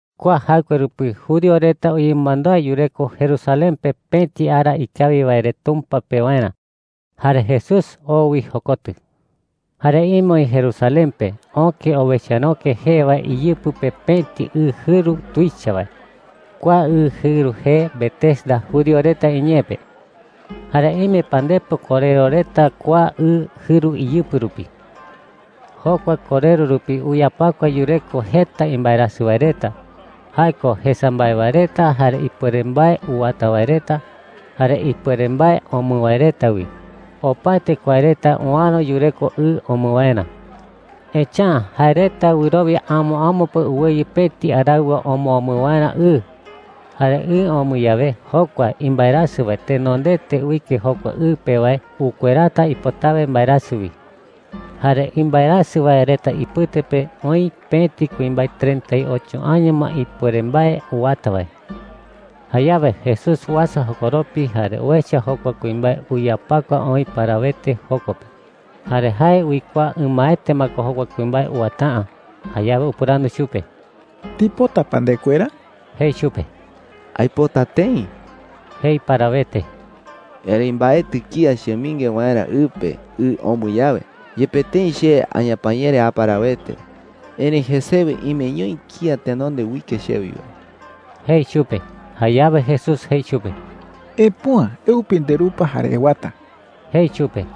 Kua jaɨkue rupi judío reta uyemɨmandúa yureko Jerusalén pe pëti ara ikawi wae re Tumpa pewarä. Jare Jesús oo wi jokotɨ. Jare ime oï Jerusalén pe öke Owecharöke jee wae iyɨpɨ pe pëti ɨ jɨru tuicha wae. Kua ɨ jɨru jee Betesda judío reta iñee pe. Jare ime pandepo korero reta kua ɨ jɨru iyɨpɨ rupi. Jokua korero rupi uyapakua yureko jeta imbaerasɨ wae reta – jae ko jesa mbae wae reta, jare ipuere mbae uwata wae reta, jare ipuere mbae omɨ wae reta wi. Opaete kua reta uäro yureko ɨ omɨ waerä. Echa’ä jae reta wɨrowia amo amo pe uweyɨ pëti araɨwa omoomɨ waerä ɨ. Jare ɨ omɨ yawe, jokua imbaerasɨ wae tenondete uike jokua ɨ pe wae ukuerata ipotawe mbaerasɨ wi. Jare imbaerasɨ wae reta ipɨte pe oï pëti kuimbae treinta y ocho año ma ipuere mbae uwata wae. Jayawe Jesús uasa jokoropi jare uecha jokua kuimbae uyapakua oï parawete joko pe. Jare jae uikuaa ɨmaete ma ko jokua kuimbae uwata’ä. Jayawe upɨrandu chupe: “¿Ndipota pa ndekuera?” jei chupe. “Aipota tëi,” jei parawete, “erëi mbaetɨ kía chemɨinge waerä ɨ pe ɨ omɨ yawe. Yepe tëi che añapañere a parawete, erëi jesewe imeñoi kía tenonde uike chewi wae,” jei chupe. Jayawe Jesús jei chupe: “Epüa. Eupi nderupa jare ewata,” jei chupe.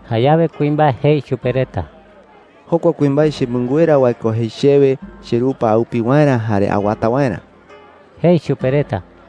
Jayawe kuimbae jei chupe reta: “Jokua kuimbae chemɨnguera wae ko jei chewe cherupa aupi waerä jare awata waerä,” jei chupe reta.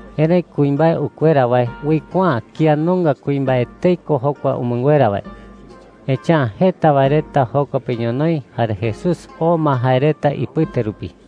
Erëi kuimbae ukuera wae uikuaa’ä kía nunga kuimbae etei ko jokua umɨnguera wae. Echa’ä jeta wae reta joko pe ñonoï jare Jesús oo ma jae reta ipɨte rupi.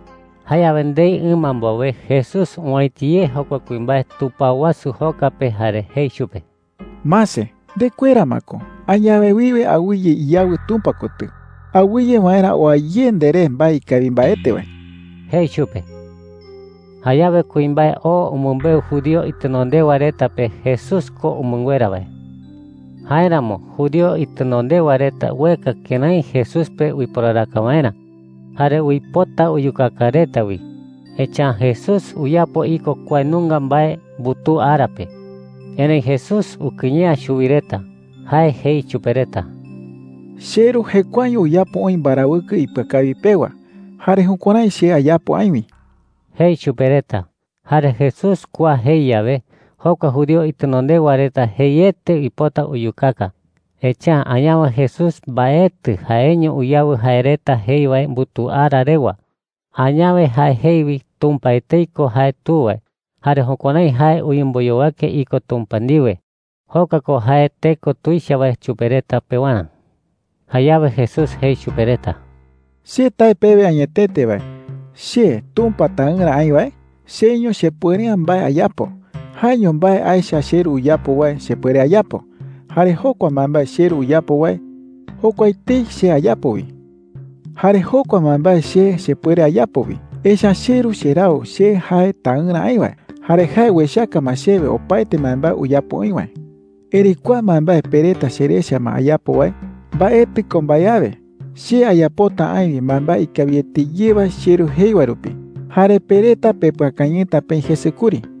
Jayawe ndei ɨma mbowe, Jesús owäiti ye jokua kuimbae tupao wasu joka pe jare jei chupe: “Mase, ndekuera ma ko. Añawe wiwe awɨye iyawɨ Tumpa kotɨ, awɨye waerä oa ye nderé mbae ikawi mbaete wae,” jei chupe. Jayawe kuimbae oo umɨmbeu judío itenondewa reta pe Jesús ko umɨnguera wae. Jáeramo judío itenondewa reta ueka kërái Jesús pe uiporaraka waerä jare uipota uyukaka reta wi, echa’ä Jesús uyapo iko kua nunga mbae mbutuu ara pe. Erëi Jesús ukɨye’ä chuwi reta. Jae jei chupe reta: “CheRu jekuaeño uyapo oï mbarawɨkɨ ipɨakawi pewa. Jare jukuärái che ayapo aï wi,” jei chupe reta. Jare Jesús kua jei yawe, jokua judío itenondewa reta jeiete uipota uyukaka. Echa’ä añawe Jesús mbaetɨ jaeño uyawɨ jae reta jei wae mbutuu ara rewa. Añawe jae jei wi Tumpa etei ko jae Tu wae, jare jukuärái jae uyemboyowake iko Tumpa ndiwe. Jokua ko jae teko tuicha wae chupe reta pewarä. Jayawe Jesús jei chupe reta: “Che tae pewe añetete wae, che Tumpa Taɨrä aï wae, cheiño chepuere’ä mbae ayapo. Jaeño mbae aecha cheRu uyapo wae chepuere ayapo. Jare jokua mbaembae cheRu uyapo wae, jokua etei che ayapo wi,” jei. “Jare jokua mbaembae che chepuere ayapo wi, echa’ä cheRu cherau che jae Taɨrä aï wae, jare jae uechaka ma chewe opaete mbaembae uyapo oï wae,” jei. “Erëi kua mbaembae pe reta cherecha ma ayapo wae, mbaetɨ ko mbae awe. Che ayapota aï wi mbaembae ikawiete ye wae cheRu jei wae rupi. Jare pe reta pepɨakañɨta peï jese kuri,” jei.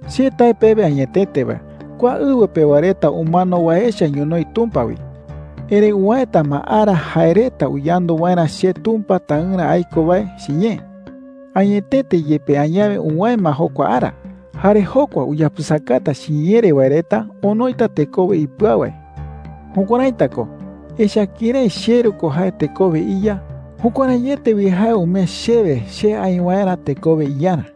“Che tae pewe añetete wae, kua ɨwɨ pewa reta umano wae echa ñonoï Tumpa wi. Erëi uwäeta ma ara jae reta uyandu waerä che Tumpa Taɨrä aiko wae chiñee. Añetete yepe añawe uwäe ma jokua ara. Jare jokua uyapɨsakata chiñee re wae reta onoita tekowe ipɨau wae. Jukuäraita ko, echa’ä kërái cheRu ko jae tekowe iYa, jukuäraiete wi jae umee chewe che aï waerä tekowe iYarä.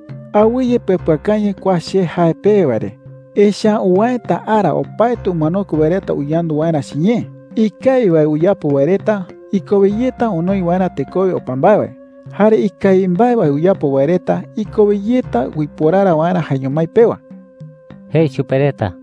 “Awɨye pepɨakañɨ kua che jae pewe wae re. Echa’ä uwäeta ara opaete umanokue wae reta uyandu waerä chiñee. Ikawi wae uyapo wae reta ikowe yeta onoi waerä tekowe opa mbae wae. Jare ikawi mbae wae uyapo wae reta ikowe yeta uiporara waerä jaeño mái pewa,” jei chupe reta.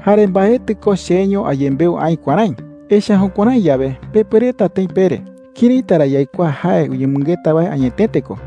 “Jare mbaetɨ ko cheño ayembeu aï kuärái. Echa’ä jukuärái yawe, pepuereta tëi pere: “¿Këraita ra yaikuaa jae uyemɨngeta wae añetete ko?’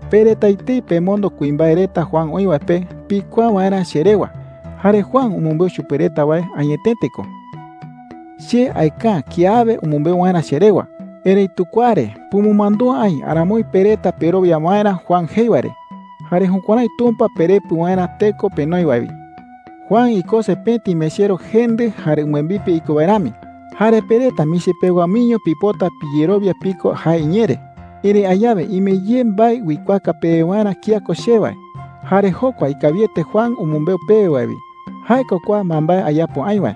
“Pe reta etei pemondo kuimbae reta Juan oï wae pe pikuaa waerä che rewa. Jare Juan umɨmbeu chupe reta wae añetete ko. Che aeka’ä kiawe umɨmbeu waerä che rewa. Erëitu kua re pumɨmandúa aï aramoi pe reta perowia waerä Juan jei wae re, jare jukuärái Tumpa perepɨ waerä teko penoi wae wi,” jei chupe reta. “Juan ikose pëti mechero jendɨ jare umbɨembipe iko wae rami. Jare pe reta michi pewa miño pipota piyerowia piko jae iñee re. Erëi añawe ime ye mbae uikuaaka pewe waerä kía ko che wae. Jare jokua ikawiete Juan umɨmbeu pewe wae wi. Jae ko kua mbaembae ayapo aï wae.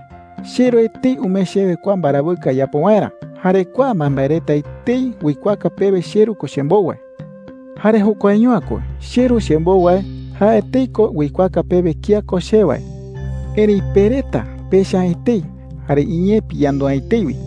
CheRu etei umee chewe kua mbarawɨkɨ ayapo waerä, jare kua mbaembae reta etei uikuaaka pewe cheRu ko chembou wae,” jei chupe reta. “Jare jokuaño’ä ko. CheRu chembou wae, jae etei ko uikuaaka pewe kía ko che wae. Erëi pe reta pecha’ä etei, jare iñee piyandu’ä etei wi.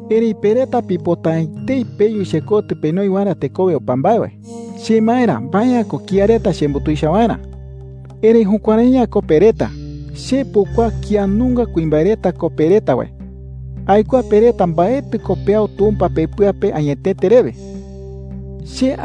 Erëi pe reta pipota’ä etei peyu chekotɨ penoi waerä tekowe opa mbae wae,” jei chupe reta. “Chemaerä, mbae’ä ko kía reta chembutuicha waerä. Erëi jukuärai’ä ko pe reta. Che pukuaa kía nunga kuimbae reta ko pe reta wae. Aikuaa pe reta mbaetɨ ko peau Tumpa pepɨa pe añetete rewe,” jei.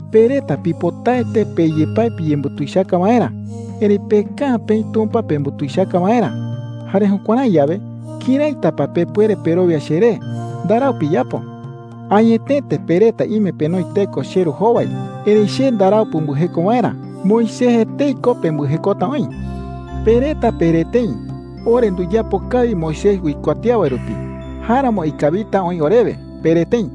“Pe reta pipotaete pe yepái piyembutuichaka waerä. Erëi peka’ä peï Tumpa pembutuichaka waerä. Jare jukuärái yawe, ¿këraita pa pepuere perowia cheré? Ndarau piyapo,” jei chupe reta. “Añetete pe reta ime penoi teko cheRu jowai, erëi che ndarau pumbɨjeko waerä. Moisés etei ko pembɨjekota oï,” jei. “Pe reta pere tëi: ‘Ore nduyapo kawi Moisés uikuatía wae rupi. Jáeramo ikawita oï orewe,’ pere tëi.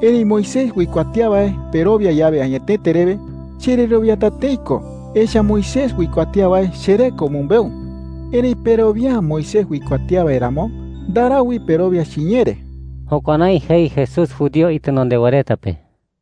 Erëi Moisés uikuatía wae perowia yawe añetete rewe, chererowiata tëi ko. Echa’ä Moisés uikuatía wae cheré ko umɨmbeu. Erëi perowia’ä Moisés uikuatía wae ramo, ndarau wi perowia chiñee re.” Jukuärái jei Jesús judío itenondewa reta pe.